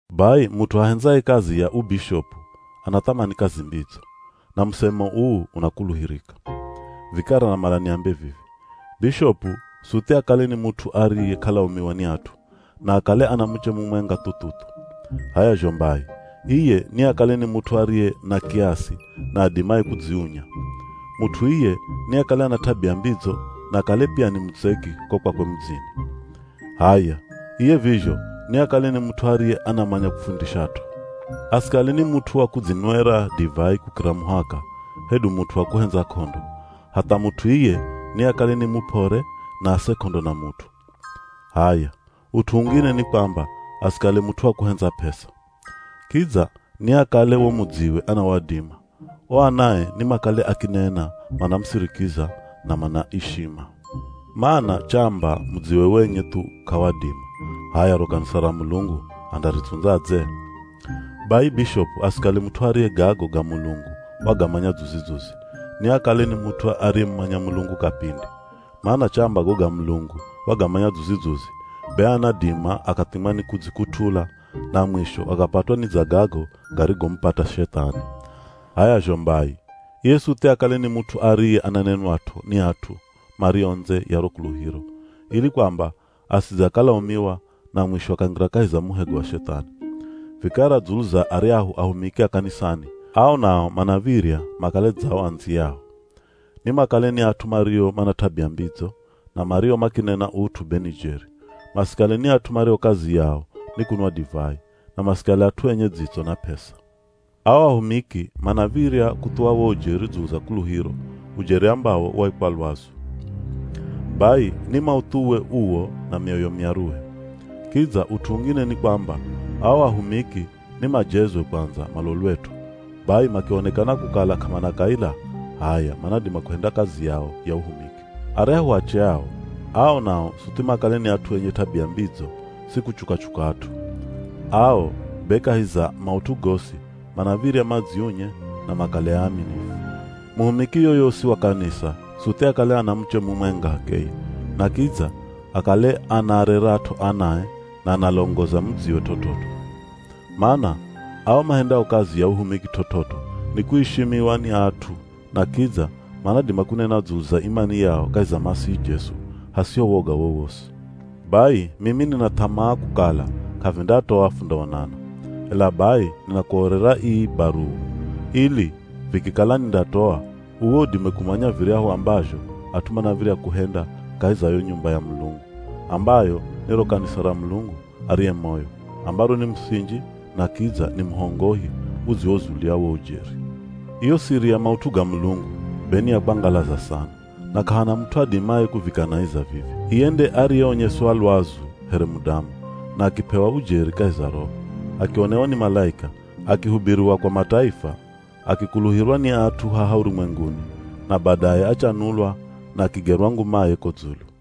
Bai mut'u ahendzaye kazi ya ubishopu, anathamani kazi mbidzo. Na musemo uu, unakuluhirika. Vikara namala niambe vivi, bishopu suthi akale ni mut'u ariye k'alaumiwa ni at'u, na akale ana muche mumwenga thu-thu-thu. H'aya zho mbai iye niakale ni mut'u ariye na kiasi na adimaye kudziunya. Mut'u iye niakale ana t'abia mbidzo na akale pia ni mutseki ko kwakwe mudzini. H'aya, iye vizho niakale ni mut'u ariye anamanya kufundishat'o. Asikale ni mut'u wa kudzinwera divai kukira muhaka hedu mut'u wa kuhendza k'ondo, hatha mut'u iye niakale ni mup'ore na ase k'ondo na mut'u. H'aya, ut'u ungine ni kwamba asikale mut'u wa kuhendza p'esa. Kidza niakale wo mudziwe anawadima, o anae nimakale akinena manamusirikiza na manaishima. (Mana chamba mudziwe wenye thu k'awadima, h'aya ro kanisa ra Mulungu andaritsundzadze?) Bai bishopu asikale mut'u ariye gago ga Mulungu wagamanya dzuzi-dzuzi, niakale ni mut'u ariyemumanya Mulungu kapindi, mana chamba go ga Mulungu wagamanya dzuzi-dzuzi, be anadima akathimwa ni kudzikut'ula, na mwisho akapatwa ni dza gago garigomupata Shethani. H'aya zho mbai, iye suthi akale ni mut'u ariye ananenwat'o ni at'u mario ndze ya ro kuluhiro, ili kwamba asidze akalaumiwa na mwisho akangira kahi za muhego wa Shethani. Vikara dzulu za aryahu ahumiki a kanisani, ao nao manav̱irya makale dza o andziyao. Nimakale ni at'u mario mana t'abia mbidzo, na mario makinena ut'u be ni jeri. Masikale ni at'u mario kazi yao ni kunwa divai, na masikale at'u enye dzitso na p'esa. Ao ahumiki manav̱irya kuthuwa wo ujeri dzulu za kuluhiro, ujeri ambawo waikwa lwazu. Bai ni mauthuwe uwo na mioyo myaruhe. Kidza ut'u ungine ni kwamba, ao ahumiki ni majezwe kwandza malolwet'o, bai makionekana kukala k'amana kaila, h'aya manadima kuhenda kazi yao ya uhumiki. Aryahu ache ao, ao nao suthi makale ni at'u enye t'abia mbidzo si kuchuka-chuka at'u. Ao be kahi za maut'u gosi manav̱irya madziunye na makale aaminifu. Muhumiki yoyosi wa kanisa suthi akale ana muche mumwenga h'akeye, na kidza akale anaarerat'o anae na analongoza mudziwe t'ot'ot'o. Mana ao mahendao kazi ya uhumiki t'ot'ot'o nikuishimiwa ni at'u na kidza manadima kunena dzulu za imani yao kahi za Masihi Jesu, hasiho woga wowosi. Bai mimi nina th'amaa kukala k'avindatoa fundaonana, ela bai ninakuorera ii baruwa ili, vikikala nindatoa, uwe udime kumanya viryahu ambazho at'u manav̱irya kuhenda kahi za yo nyumba ya Mulungu, ambayo ni ro kanisa ra Mulungu ariye moyo, ambaro ni musinji na kidza ni muhongohi udziwozulia wo ujeri. Iyo siri ya maut'u ga Mulungu be ni ya kwangalaza sana, na k'ahana mut'u adimaye kuvikanaiza vivi. Iye nde ariyeonyeswa lwazu here mudamu, na akip'ewa ujeri kahi za roho, akionewa ni malaika, akihubiriwa kwa mataifa, akikuluhirwa ni at'u haha urumwenguni na badaye achanulwa na akigerwa ngumaye ko dzulu.